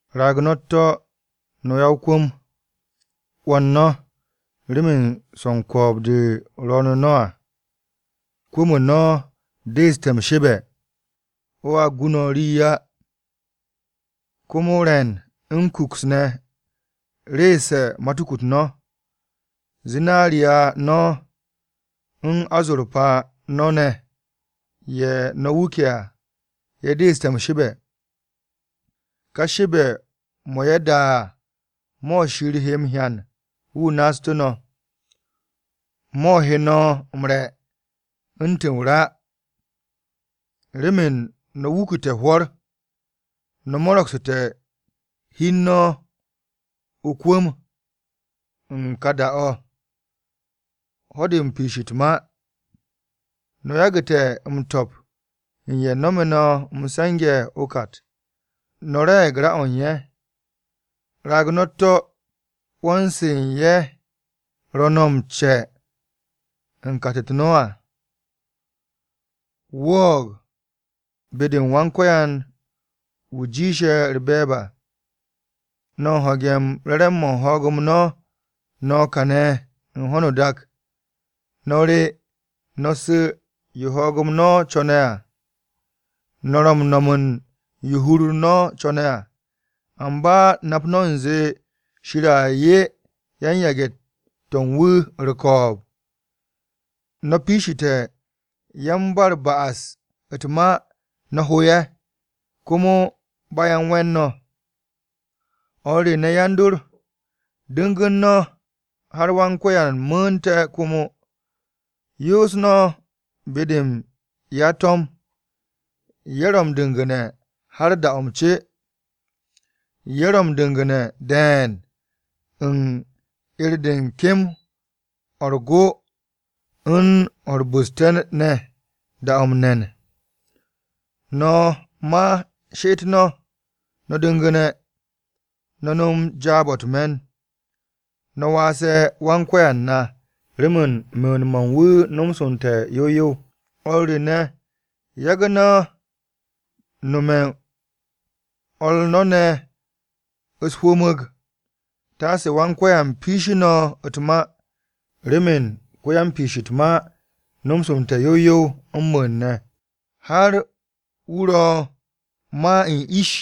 Raag no̱ u̱t-to̱ no̱ ya-o-kwu̱m, 'wo̱n no̱ remen swo̱ u̱n ko̱o̱b-de ro̱o̱nu̱ no̱ à. Kwu̱m-o no̱ deeste̱ m-shebe̱, o̱a gu no̱ rii á. Komo re̱n u̱n kuks ne̱ reese̱ matuku-u̱t no̱. Zinariya no̱ u̱n azorpa no̱ ne̱ ye̱ no̱ wuke̱ à ye̱ deeste̱ m-shebe̱. Ka shebe̱-mo̱ ye̱ da à, mo̱ Shir he m-hyan wu̱ naastu̱ no̱, mo̱ he no̱ m-re̱ u̱ntu̱ o-ra. Remen no̱ wukute̱ hwo̱r, no̱ mo̱ro̱gsu̱te̱ hi u̱n no̱ o-kwu̱m u̱n ka da-o̱, ho̱-de piish u̱t-ma. No̱ yagu̱te̱ m-to̱p u̱n ye̱ nome̱ no̱ m-se̱nge̱ o-kat. No̱ re̱e̱g ra-o̱ u̱n ye̱. Raag no̱ u̱t-to̱, 'wo̱n-se u̱n ye̱ ro̱ no̱ m-ce u̱n kat-u̱t no̱ à, wo̱o̱g be-de Yawe wu̱ jiishe̱ u̱r-be̱e̱b à. No̱ u̱n ho̱ge̱ u̱n re̱re̱m-mo̱ u̱n ho̱o̱g-m no̱ kane̱ u̱n ho̱no o-dak. No̱ re no̱ su̱ yo ho̱o̱g-m no̱ co̱ne̱ à. No̱ ro̱ m-no̱m u̱n yo hur-u̱r no̱ co̱ne̱ à, amba nap no̱ u̱nze Shir a 'ye yan-yage̱-to̱ u̱n wu̱ u̱r-ko̱o̱b. No̱ piishite̱ yan-ba-u̱r-ba'as u̱t-ma no̱ ho ye̱. Komo ba ye̱ u̱n we̱n no̱. O̱r re ne̱ yan-dor, du̱ngu̱n no̱ har Wan-Ko̱yan mu̱u̱nte̱ komo. Yoos no̱ be-de u̱n ya-to̱m. Ye̱ ro̱ m-du̱ngu̱ne̱ har da-o̱ m-ce. Ye̱ ro̱ m-du̱ngu̱ne̱ de̱e̱n u̱n 'er-de u̱n kem-o̱ u̱r-go u̱n o̱ u̱r-bu̱ste̱ ne̱ da-o̱ m-ne̱n. No̱ ma she'et no̱, no̱ du̱ngu̱ne̱. No̱ nom jaab-o̱ u̱t-me̱n, no̱ waase̱ Wan-Ko̱yan na, remen mu̱u̱n-mo̱ u̱n wu̱ nomsu̱nte̱ yow yow. O̱r re ne̱, yagu̱ no̱ nome̱ u̱n o̱r no̱ ne̱ u̱s-hwu̱mu̱g. Taase Wan-Ko̱yan piishi no̱ u̱t-ma. Remen ko-yan-Piish u̱t-ma nomsu̱nte̱ yow yow m-mu̱u̱n ne̱, har wu̱ ro̱ ma u̱n ish!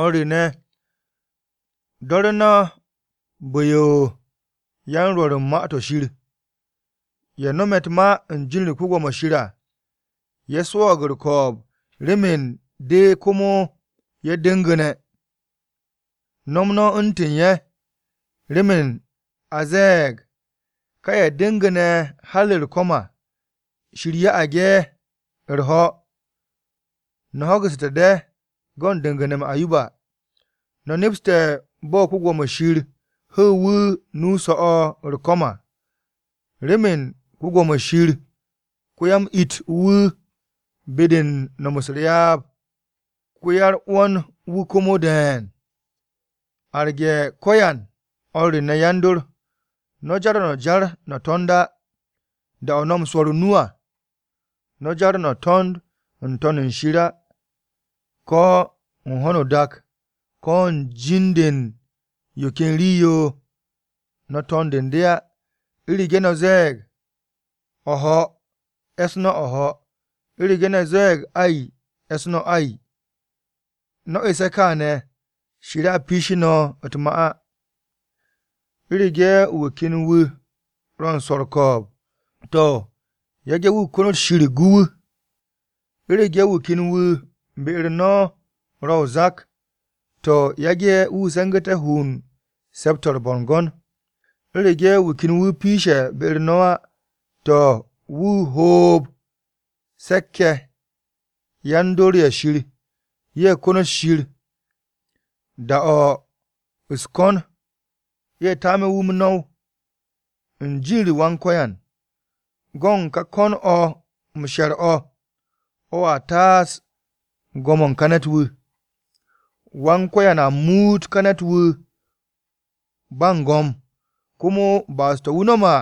O̱r re ne̱, do̱ru̱ no̱ bu̱-yo yan-rwo̱r u̱n Ma-to̱ Shir. Ye̱ no̱me̱ u̱t-ma u̱n jin-u̱r Wan-Ko̱yan à, ye̱ swo̱o̱g u̱r-ko̱o̱b remen de komo ye̱ du̱ngu̱ne̱. No̱m no̱ u̱ntu̱n ye̱. Remen a ze̱e̱g, ka ye̱ du̱ngu̱ne̱ har u̱r-ko̱m à, Shir ya'ag ye̱ u̱r-ho̱. No̱ ho̱gu̱ssu̱te̱ de go̱n du̱ngu̱ne̱-m Ayoba, no̱ nepse̱ bo̱ Wan-Ko̱yan hu̱u̱ wu̱ nu-o so̱-o̱ u̱r-ko̱m à. Remen Wan-Ko̱yan ko-ya-m-it wu̱ be-de u̱n no̱m u̱s-ryaab, ko-ya-u̱r-'wo̱n wu̱ komo de̱e̱n. Arge̱ ko̱yan, o̱r re ne̱ yan-dor, no̱ jar o-jar no̱ to̱nd á. Da-o̱ no̱ m-swo̱r o-nu à, no̱ jar no̱ to̱nd n-To̱n u̱n shir á, ko̱ u̱n ho̱no o-dak, ko̱ u̱n jin-de u̱n yo ken rii-yo, no̱ to̱nd u̱n de á. U̱rege̱ no̱ ze̱e̱g “O̱ho̱,” e̱ss no̱ “O̱ho̱.” U̱rege̱ no̱ ze̱e̱g “Ay,” e̱ss no̱ “Ay.” No̱ esse̱ kaane̱, Shir a piishi no̱ u̱t-ma á. U̱rege̱ wu̱ ken wu̱ ro̱ u̱n swo̱ u̱r-ko̱o̱b, to̱, yage̱ wu̱ konot Shir gu wu̱. U̱rege̱ wu̱ ken wu̱ be-u̱r no̱ ro̱ o-zak, to̱, yage̱ wu̱ se̱ngu̱te̱ hu u̱n se̱p-to̱ u̱r-bo̱ngo̱n. U̱rege̱ wu̱ ken wu̱ piishe̱ be-u̱r no̱ á, to̱, wu̱ hoob se̱k-ye̱ yan-dor ye̱ Shir, ye̱ konot Shir. Da-o̱ u̱s-ko̱n, ye̱ taame̱ wu̱ m-no̱w u̱n jin-u̱r Wan-Ko̱yan. Go̱n ka ko̱n o̱ m-she̱r o̱, o̱a taas go̱m-o̱ u̱n ka ne̱t-wu̱. Wan-Ko̱yan a muut ka ne̱t-wu̱ ba u̱n go̱m, komo ba'as-to̱ wu̱ nome̱ à,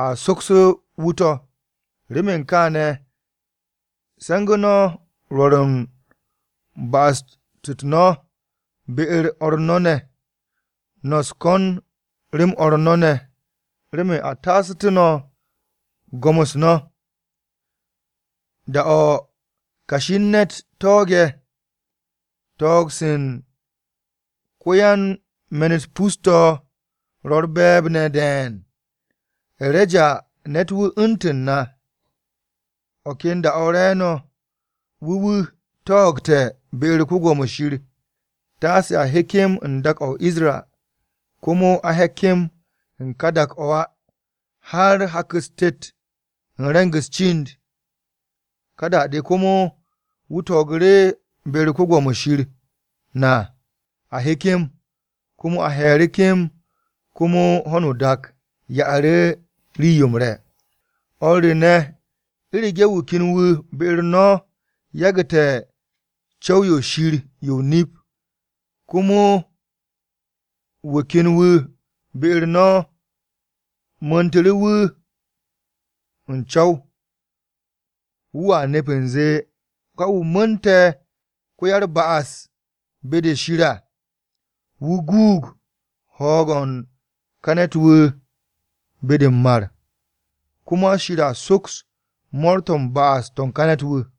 a sokse̱ wu̱ to̱. Remen kaane̱, se̱ngu̱ no̱ rwo̱r u̱n ba'as-u̱t no̱ be-u̱r o̱r no̱ ne̱, no̱ u̱s-ko̱n rem o̱r no̱ ne̱, remen a taasu̱tú̱ no̱ go̱m-u̱s no̱. Da-o̱ kashi u̱n ne̱t ko̱ne̱, ko̱n-se u̱n ko-yan-me̱n-u̱t pus-to̱ ro̱ u̱r-be̱e̱b ne̱ de̱e̱n. E̱reja ne̱t-wu̱ u̱ntu̱n na. O̱ ken da-o̱ re̱e̱no̱, wu̱ wu̱ ko̱ne̱ be-u̱r Shir, taase a he kem u̱n dak-o̱ Isra. Komo a he kem u̱n ka dak-o̱ á, har hak-u̱s tet u̱n re̱ng-u̱s cind. Ka da-de komo wu̱ ko̱nu̱ru̱ be-u̱r Shir na a he kem. Komo a he̱e̱ru̱ kem, komo ho̱no o-dak ya'u̱ru̱ rii-yo m-re̱. O̱r re ne̱, u̱rege̱ wu̱ ken wu̱ be-u̱r no̱ yagu̱te̱ co̱w-yo Shir yo o-nip, komo wu̱ ken wu̱ be-u̱r no̱ mu̱u̱ntu̱ru̱ wu̱ u̱n co̱w, wu̱a nept u̱nze, ka wu̱ mu̱u̱nte̱ ko-ya-u̱r-ba'as be-de Shir à, wu̱ guug ho̱o̱g-o̱ u̱n ka ne̱t-wu̱ be-de m-mar. Komo Shir a soks mo̱o̱r-to̱ u̱n ba'as-to̱ u̱n ka ne̱t-wu̱.